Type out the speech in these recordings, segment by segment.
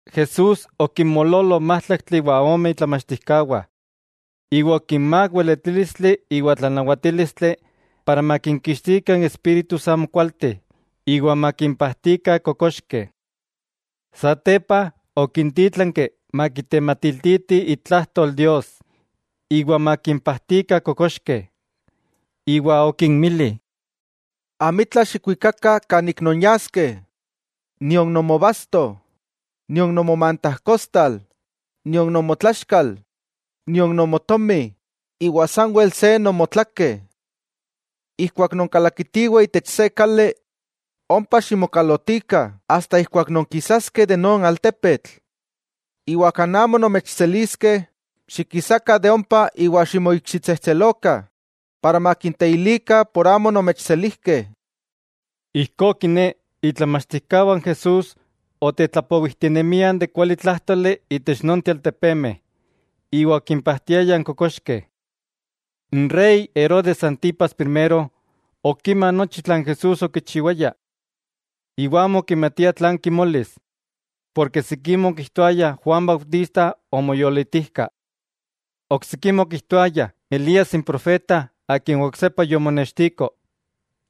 Jesús okinmoololo májtlakteh iwa ome itlamachtijkawah iwa okinmák weletílistli iwa tlanawatílistli para makinkixtikah n espíritus amokualteh iwa makimpajtikah kokoxkeh. Satepa okintítlanki makitematiltiti itlajtol Dios, iwa makinpajtikah kokoxkeh. Iwa okinmili: —Amitla xikwikakah kan ik nonyaskeh, nion nomobasto, nion nomomantajkostal, nion nomotlaxkal, nion nomotomi, sanwel se nomotlakeh. Ijkuak nonkalakitiweh itech se kali, ompa ximokalotikah asta ijkuak non kisaskeh de non altepetl. Iwa kan amo nomechseliskeh, xikisakah de ompa iwa ximoikxitsejtselokah para makinteilikah por amo onomechselijkeh. Ijkó kiné, itlamachtijkawah n Jesús otetlapowijtinemiah n kualitlájtoli itech nochteh n altepemeh, iwa okimpajtiayah kokoxkeh. N rey Herodes Antipas Primero okima nochi tlan Jesús okichiwaya; iwa amo okimatia tlan kimolis, porke sikimeh okijtoayah Juan Bautista omoyolitijka. Oksikimeh okijtoayah Elías n profeta akin oksepa yomonextiko,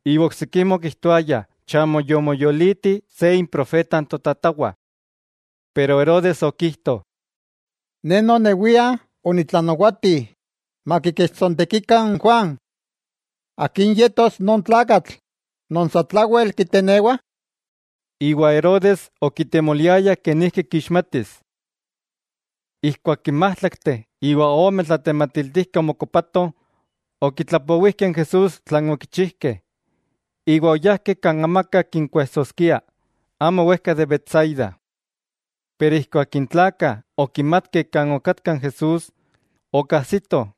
iwa oksikimeh okijtoayah chamo yomoyoliti se improfeta totatawah. Pero Herodes okijto: —Ne nonewia onitlanawati makikechtsontekikah n Juan. ¿Akin yetos non tlakatl non satlawel kitenewah? Iwa Herodes okitemoliaya kenijki kixmatis. Ijkuak n májtlakteh iwa ome tlatematiltijkeh omokopatoh, okitlapowijkeh n Jesús tlan okichijkeh, iwa oyajkeh kan amaka kinkuejsoskia, amo wejka de Betsaida. Pero ijkuak n tlakah okimatkeh kan okatka n Jesús, okajsitoh,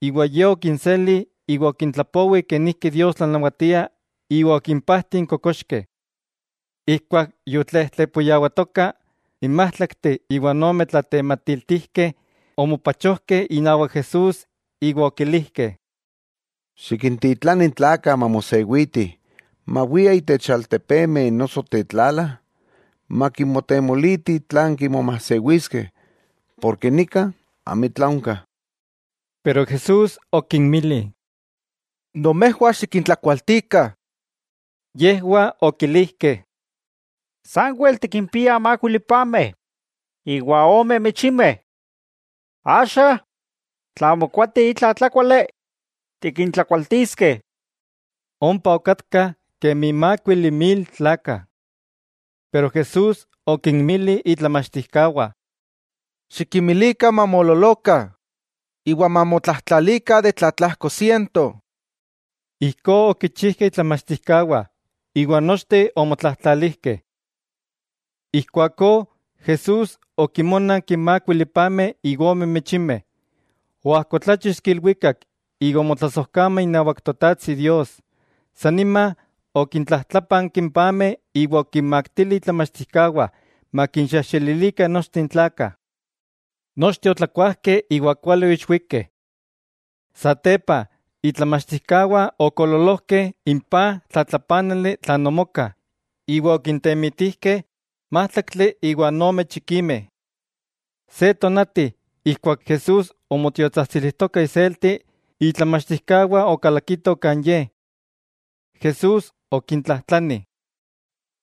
iwa Ye okinseli iwa okintlapowi kenijki Dios tlanawatia iwa okimpajti n kokoxkeh. Ijkuak yotlejtlepuyawatoka, n májtlaktli iwa n ome tlatematiltijkeh onmopachojkeh inawak Jesús iwa okilijkeh: —Xikintitlani n tlakah mamosewitih, mawiah itech altepemeh noso tetlala makimotemolitih tlan kimomajsewiskeh, porke nika amitla onka. Pero Jesús okinmili: —Nomejwah xikintlakualtikah. Yejwah okilijkeh: —Sanwel tikimpiah mákuili pameh iwa ome michimeh. Axa, tla mokoati itla tlákuali, tikintlakualtiskeh. Ompa okatkah kemi mákuili mil tlakah. Pero Jesús okinmili itlamachtijkawah: —Xikinmilikah mamoololokah iwa mamotlajtlalikah de tlatlajko siento. Ijkó okichijkeh itlamachtijkawah, iwa nochteh omotlajtlalijkeh. Ijkuakó Jesús okinmónanki n mákuili pameh iwan ome michimeh. Oajkotláchixki ilwikak iwa omotlasojkama inawak Totajtsi Dios, sanima okintlajtlápanki n pameh iwa okinmaktili itlamachtijkawah makinxejxelilikah nochteh n tlakah. Nochteh otlakuajkeh iwa kuali oixwikeh. Satepa itlamachtijkawah okoololojkeh n paj tlatlapánali tlan omoka, iwa okintemitijkeh májtlaktli iwa ome chikimeh. Se tonati ijkuak Jesús omotiotsajtsilijtoka iselti, itlamachtijkawah okalakito kan Ye. Jesús okintlajtlani: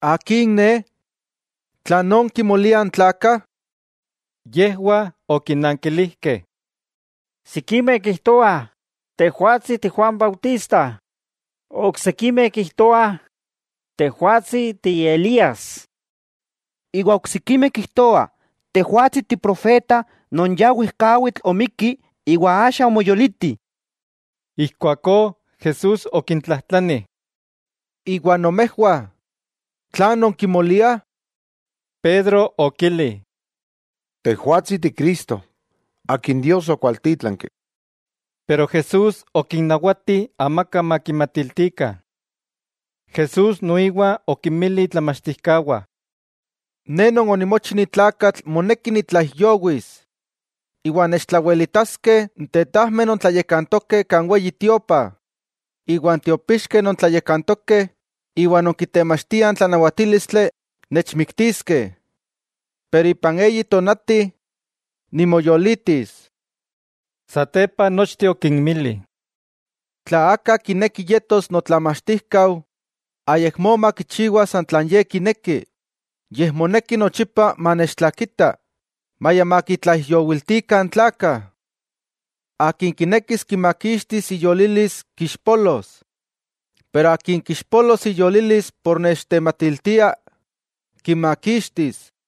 —¿Akin Ne? ¿Tlan kimoliah n tlakah? Yejwah okinankilijkeh: —Sikimeh kijtoah Tejwatsi ti Juan Bautista, oksikimeh kijtoah Tejwatsi ti Elías, iwa oksikimeh kijtoah Tejwatsi tiprofeta non ya wejkawitl omikki iwa axa omoyoliti. Ijkuakó, Jesús okintlajtlani: —Iwa nomejwah, ¿tlan nonkimoliah? Pedro okili: —Tejwatsi Ti Cristo Akin Dios okwaltítlanki. Pero Jesús okinnawati amaka makimatiltikah. Jesús noiwa okinmili itlamachtijkawah: —Ne Non onimochi ni tlakatl moneki nitlaijyowis, iwa nechtlawelitaskeh n tetajmeh non tlayakantokeh kan Weyi Tiopa, iwa n tiopixkeh non tlayakantokeh, iwa non kitemachtiah n tlanawatílistli, nechmiktiskeh. Pero ipan eyi tonati nimoyolitis. Satepa nochteh okinmili: —Tla aka kineki yetos notlamachtijkau, ayakmó makichiwa san tlan ye kineki, yej moneki nochipa manechtlakita, maya makitlaijyowiltikah n tlakah. Akin kinekis kimakixtis iyolilis kixpolos, pero akin kixpolos iyolilis por nechtematiltia, kimakixtis.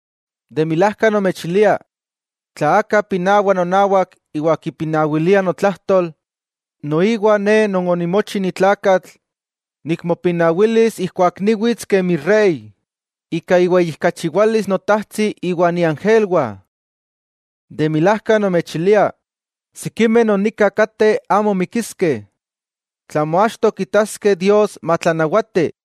De milajka nomechilia, tla aka pinawa nonawak iwa kipinawilia notlajtol, noiwa Ne Non onimochi ni tlakatl nikmopinawilis ijkuak niwits kemi Rey, ika iweyijkachiwalis Notajtsi iwan iángelwah. De milajka nomechilia sikimeh non nika kateh amo mikiskeh tlamo achto kitaskeh Dios matlanawati.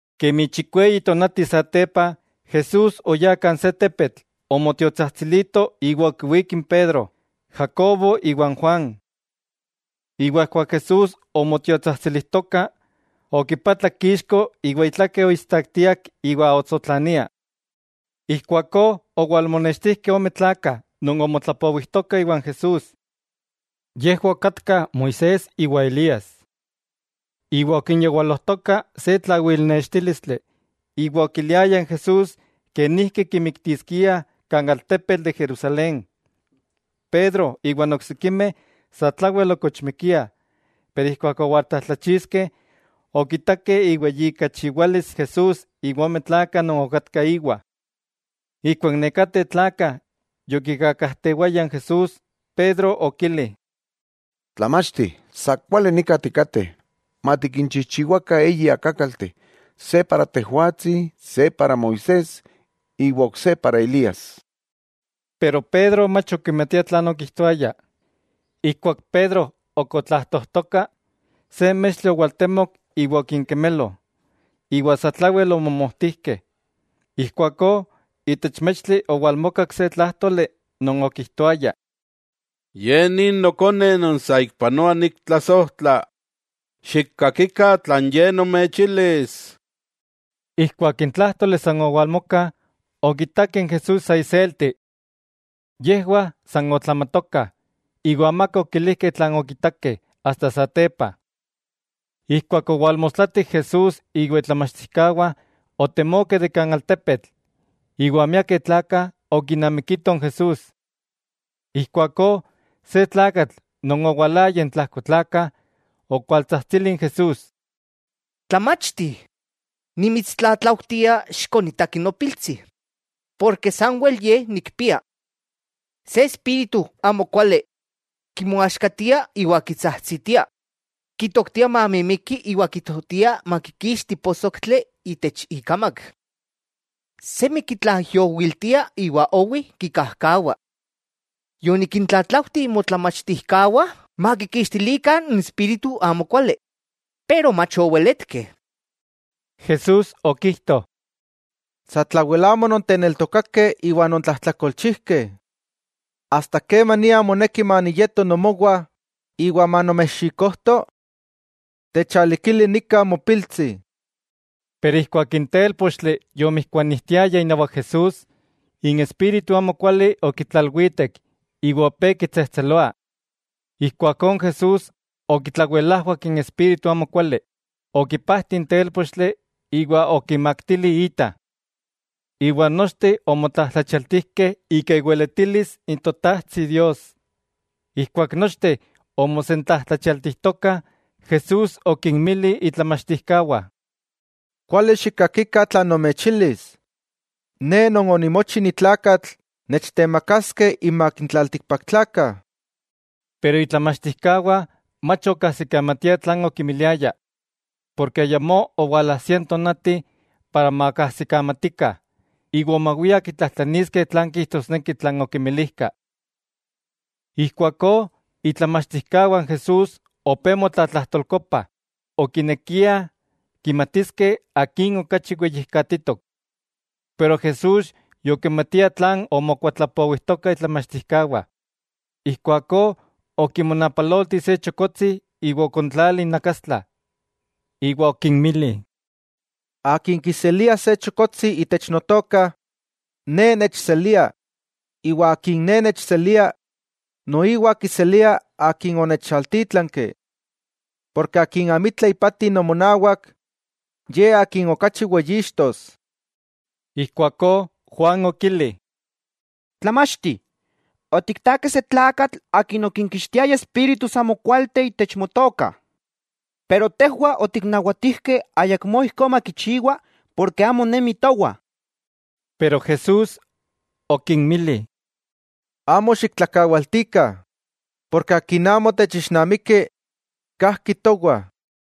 Kemi chikweyi tonati satepa, Jesús oyá kan se tepetl omotiotsajtsilito iwa okiwík n Pedro, Jacobo iwa n Juan. Iwa ijkuak Jesús omotiotsajtsilijtoka, okipatlak ixko iwa itlakeh oistaktiak iwa otsotlania. Ijkuakó owalmonextijkeh ome tlakah non omotlapowijtokah iwan Jesús. Yejwah okatkah Moisés iwa Elías. Iwa okinyawalojtoka se tlawilnextílistli, iwa okiliayah n Jesús kenijki kimiktiskiah kan altepetl de Jerusalén. Pedro iwan oksikimeh satlawel okochmikiah, pero ijkuak owaltlajtlachixkeh, okitakeh iweyijkachiwalis Jesús iwan ome tlakah non okatkah íwa. Ijkuak nekateh tlakah yokikakajtewayah n Jesús, Pedro okili: —Tlamachti, ¡Sa kuali nika tikateh! Matikinchijchiwakah eyi akákalteh, se moaxka, se iaxka Moisés iwa ok se iaxka Elías. Pedro mach okimatia tlan okijtoaya. Ijkuak Pedro ok otlajtojtoka, se mextli owaltemok iwa okinkemelo, iwa satlawel omomojtijkeh. Ijkuakó itech mextli owalmokak se tlájtoli non okijtoaya: —Ye ni Nokone non saikpanoa niktlasojtla: xikkakikah tlan Ye nomechilis. Ijkuak n tlájtoli san owalmoka, okitakeh n Jesús sa iselti. Yejwah san otlamatokah, iwa amaka okilijkeh tlan okitakeh asta satepa. Ijkuak owalmostlatik Jesús iwa itlamachtijkawah otemokeh de kan tepetl, iwa miakeh tlakah okinamikitoh n Jesús. Ijkuakó se tlakatl non owalaya intlajko n tlakah, okualtsajtsili n Jesús: —Tlamachti, nimitstlatlaujtia xikonitaki nopiltsi, porke sanwel ye nikpia. Se espíritu amokuali kimoaxkatia iwa kitsajtsitia; kitoktia mamimiki iwa kitoktia makikixti posoktli itech ikamak. Semi kitlaijyowiltia iwa owi kikajkawa. Yonikintlatlaujti motlamachtijkawah makikixtilikah n espíritu amokuali, pero mach oweletkeh. Jesús okijto: —¡Satlawel amo nonteneltokakeh iwa nontlajtlakolchijkeh! ¿Asta kemania moneki maniyeto nomowah iwa manomechxikojto? Techalikili nika mopiltsi. Pero ijkuak n télpochtli yomijkuanijtiaya inawak Jesús, n espíritu amokuali okitlalwitek iwa opé kitsejtseloa. Ijkuakó n Jesús okitlawelajwak n espíritu amokuali, okipajti n télpochtli iwa okimaktili ita. Iwa nochteh omotlajtlachialtijkeh ika iweletilis n Totajtsi Dios. Ijkuak nochteh omosentlajtlachialtijtokah, Jesús okinmili itlamachtijkawah: —Kuali xikkakikah tlan nomechilis: Ne Non onimochi ni tlakatl nechtemakaskeh inmak n tlaltikpaktlakah. Pero itlamachtijkawah mach okajsikamatiah tlan okimiliaya porke ayamó owalajsia n tonati para makajsikamatikah, iwa omawiah kitlajtlaniskeh tlan kijtosneki tlan okimilijka. Ijkuakó itlamachtijkawah n Jesús opé motlatlajtolkopah, okinekiah kimatiskeh akin okachi weyijkatitok, pero Jesús yokimatia tlan omokuatlapowijtokah itlamachtijkawah. Ijkuakó okimonapalolti se chokotsi iwa okontlali inakastla iwa okinmili: —Akin kiselia se chokotsi itech Notoka, Ne nechselia, iwa akin Ne nechselia, noiwa kiselia akin onechaltítlanki. Porke akin amitla ipati nomonawak, ye akin okachi weyixtos. Ijkuakó Juan okili: —Tlamachti, otiktakeh se tlakatl akin okinkixtiaya espíritus amokualteh itech Motoka. Pero tejwah otiknawatijkeh ayakmó ijkó makichiwa, porke amo nemi towah. Pero Jesús okinmili: —Amo xiktlakawaltikah, porke akin amo techixnamiki, kajki towah.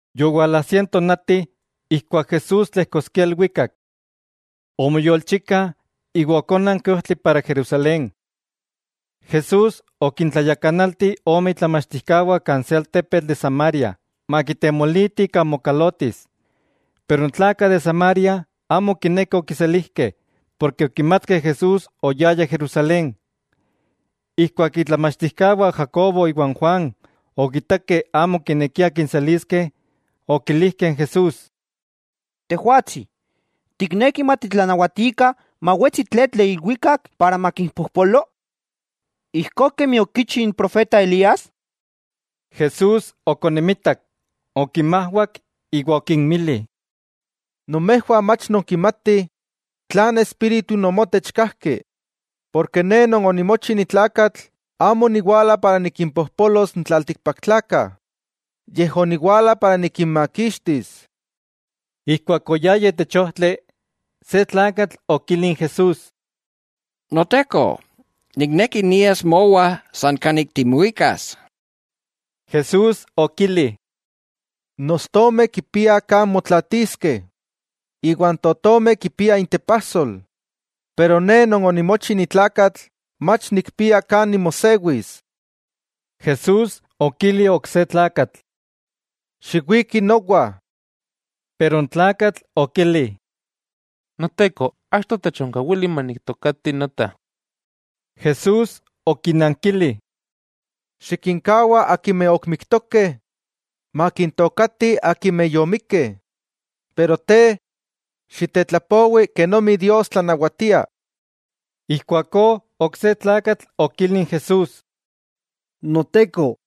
Yowalajsia n tonati ijkuak Jesús tlejkoskia ilwikak. Omoyolchika iwa okónanki ojtli para Jerusalén. Jesús okintlayakanalti ome itlamachtijkawah kan se altepetl de Samaria makitemolitih kan mokalotis. Pero n tlakah de Samaria amo okinekeh okiselijkeh, porke okimatkeh Jesús oyaya Jerusalén. Ijkuak itlamachtijkawah Jacobo iwa n Juan, okitakeh amo okinekiah kinseliskeh, okilijkeh n Jesús: —Tejwatsi, ¿tikneki matitlanawatikah mawetsi tletl de ilwikak para makimpojpolo, ijkó kemi okichi n profeta Elías? Jesús okonimitak, okinmajwak iwa okinmili: —Nomejwah mach nonkimatih tlan espíritu nomotech kajki. Porke Ne Non onimochi ni tlakatl amo oniwala para nikimpojpolos n tlaltikpaktlakah, yej oniwala para nikinmakixtis. Ijkuak oyayah itech ojtli, se tlakatl okili n Jesús: —Noteko, nikneki nias mowa san kanik timuikas. Jesús okili: —N ostomeh kipiah kan motlaatiskeh, iwa n totomeh kipiah intepajsol. Pero Ne Non onimochi ni tlakatl mach nikpia kan nimosewis. Jesús okili ok se tlakatl: —Xiwiki nowa. N tlakatl okili: —Noteko, achto techonkawili maniktookati nota. Jesús okinankili: —Xikinkawa akimeh ok miktokeh makintookatih akimeh yomikkeh, pero te, xitetlapowi kenomi Dios tlanawatia. Ijkuakó ok se tlakatl okili n Jesús: —Noteko,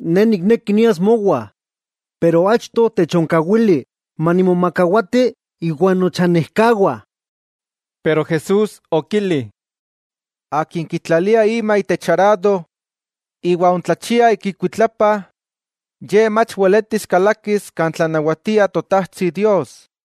ne nikneki nias mowah, pero achto techonkawili manimomakawati íwan nochanejkawah. Pero Jesús okili: —Akin kitlalia ima itech arado iwa ontlachia ik ikuitlapa, ye mach weletis kalakis kan tlanawatia Totajtsi Dios.